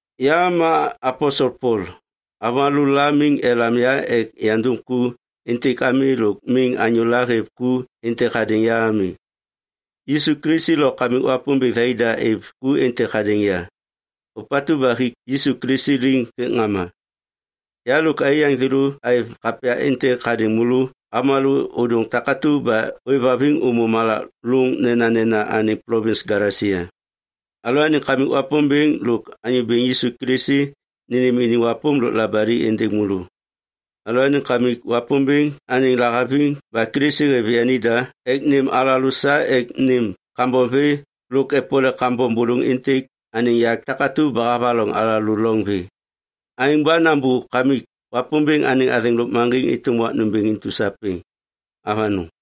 Ya ma aposel Pol. Avômalô la miŋ elam ya ek yandum ku êntêk ami lôk miŋ anyôla hêv ku êntêk hadêŋ ya ami. Yisu Kilisi lo Kamik Wapômbêŋ thai da êv ku êntêk hadêŋ ya, ôpatu ba hik Yisu Kilisi liŋ hêk ŋama. Ya lôk aiyaŋ thêlô aêv kapya êntêk hadêŋ môlô avômalô ôdôŋ takatu ba ôêvhaviŋ ômô malak lôŋ nenanena anêŋ plovins Galesia. Alalôaniŋ Kamik Wapômbêŋ lôk Anyô Bêŋ Yisu Kilisi nênêm iniŋ wapôm lôk labali êndêŋ môlô. Alalôaniŋ Kamik Wapômbêŋ anêŋ lahaviŋ ba Kilisi hêv yanida ek nêm alalô sa ek nêm kambom vê lôk epole kambom bôlôŋ êntêk anêŋ yak takatu ba havaloŋ alalô loŋ vê. Aêŋ ba nambô Kamik Wapômbêŋ anêŋ athêŋ lôkmaŋgiŋ êtôm wak nômbêŋ intu sapêŋ. Avanôŋ!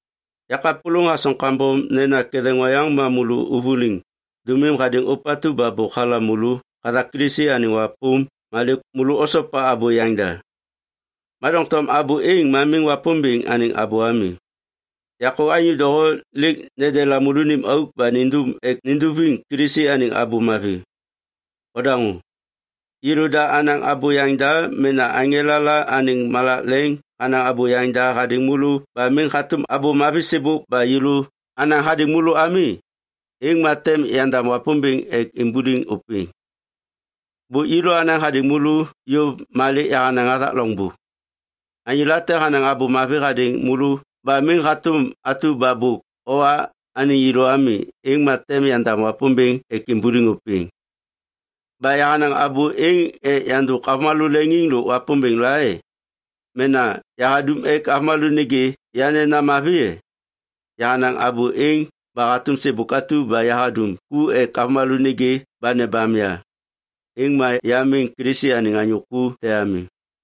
Ya kapôlôŋ hasoŋ kambom nena ketheŋ oyaŋ ma môlô ôvôliŋ dômim hadêŋ ôpatu ba bôk halam môlô hathak Yisu Kilisi anêŋ wapôm ma lêk môlô osopa abô yaŋda. Ma doŋtom abô êŋ ma miŋ Wapômbêŋ anêŋ abô ami. Yakô anyô doho lêk nendela môlônim auk ba nindum ek ninduviŋ Kilisi anêŋ Abô Mavi. Odaŋô! Yêlôda anaŋ abô yaŋda mena aŋela la anêŋ malak leŋ hanaŋ abô yaŋda hadêŋ môlô ba miŋ hatôm Abô Mavi sêbôk ba yêlô anaŋ hadêŋ môlô ami, êŋ ma tem yandam Wapômbêŋ ek imbuliŋ ôpêŋ. Bôk yêlô anaŋ hadêŋ môlô yôv ma lêk yahanaŋ hathak loŋbô. Anyô late hanaŋ Abô Mavi hadêŋ môlô ba miŋ hatôm atu ba bôk owa anêŋ yêlô ami, êŋ ma tem yandam Wapômbêŋ ek imbuliŋ ôpêŋ. Ba yahanaŋ abô êŋ ek yandôk avômalô leŋiŋ lôk Wapômbêŋ la e? Mena yahadum ek avômalô nêgê ya nena mavi e? Yahanaŋ abô êŋ ba hatôm sêbôk atu ba yahadum ku ek avômalô nêgê ba nebam ya, êŋ ma ya miŋ Kilisi anêŋ anyô ku te ami.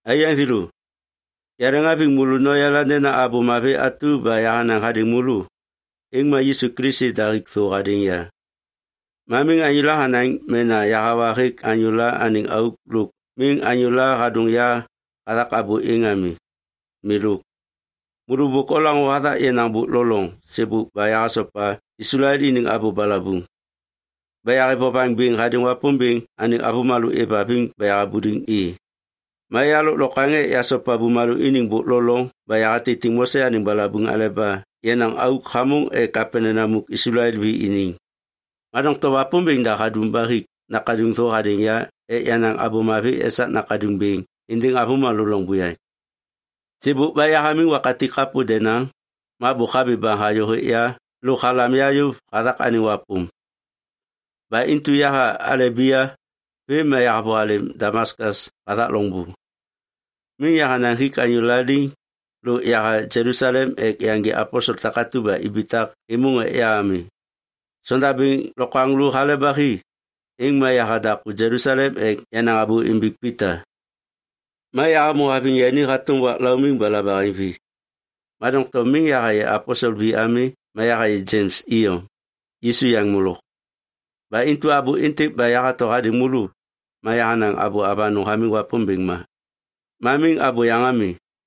Aiyaŋ thêlô, yaleŋhaviŋ môlô noyala nena Abô Mavi atu ba yahanaŋ hadêŋ môlô, êŋ ma Yisu Kilisi da hik thô hadêŋ ya. Ma miŋ anyôla hanaŋ mena yahawa hêk anyôla anêŋ auk lôk miŋ anyôla hadôŋ ya hathak abô êŋ ami. Milôk. Môlô bôk olaŋô hathak yenaŋ bôk lo loŋ sêbôk ba yahasopa Islael iniŋ abô balabuŋ, ba yahêv vovaŋ bêŋ hadêŋ Wapômbêŋ anêŋ avômalô êvhaviŋ ba yahabuliŋ i. Ma ya lôklokwaŋ ek yasopa bumalô iniŋ bôk lo loŋ ba yahatitiŋ Mose anêŋ balabuŋ aleba yenaŋ auk hamôŋ ek apenena muk Islael vi iniŋ. Ma doŋtom Wapômbêŋ da hadum ba hik nakaduŋ thô hadêŋ ya ek yanaŋ Abô Mavi esak nakaduŋ bêŋ êndêŋ avômalô loŋ buyaŋ. Sêbôk ba yahamiŋ wakatik kapô denaŋ, ma bôk habi baŋ hayô hêk ya lôk halam ya yôv hathak anêŋ wapôm. Ba intu yaha Alebia vêm ma yahavôhalêm Damaskas hathak loŋbô. Miŋ yahanaŋ hik anyôla liŋ lôk yaha Jelusalem ek yaŋgê aposel takatu ba ibitak êmôŋ ek ya ami. Sondabêŋ lokwaŋlô hale ba hi, êŋ ma yaha daku Jelusalem ek yanaŋ abô imbiŋ Pita. Ma yahamô haviŋ yani hatôm wak laumiŋ ba labaheŋvi. Ma doŋtom miŋ yahayê aposel vi ami ma yahayê Jems iyom, Yisu yaŋ molok. Ba intu abô êntêk ba yahato hadêŋ môlô, ma yahanaŋ abô avanôŋ hamiŋ Wapômbêŋ ma. Ma miŋ abôyaŋ ami.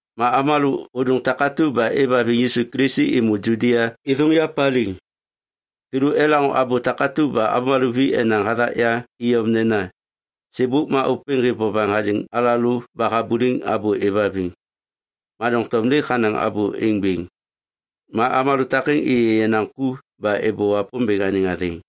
Ma avômalô ôdôŋ takatu ba êvhaviŋ Yisu Kilisi êmô Judia êthôŋ ya paliŋ. Thêlô elaŋô abô takatu ba avômalô vi enaŋ hathak ya iyom nena, “Sêbôk ma ôpêŋ hêv vovaŋ hadêŋ alalô ba habuliŋ abô êvhaviŋ. Ma doŋtom lêk hanaŋ abô êŋ bêŋ.” Ma avômalô takêŋ êyê yenaŋ ku ba êbô Wapômbêŋ anêŋ athêŋ.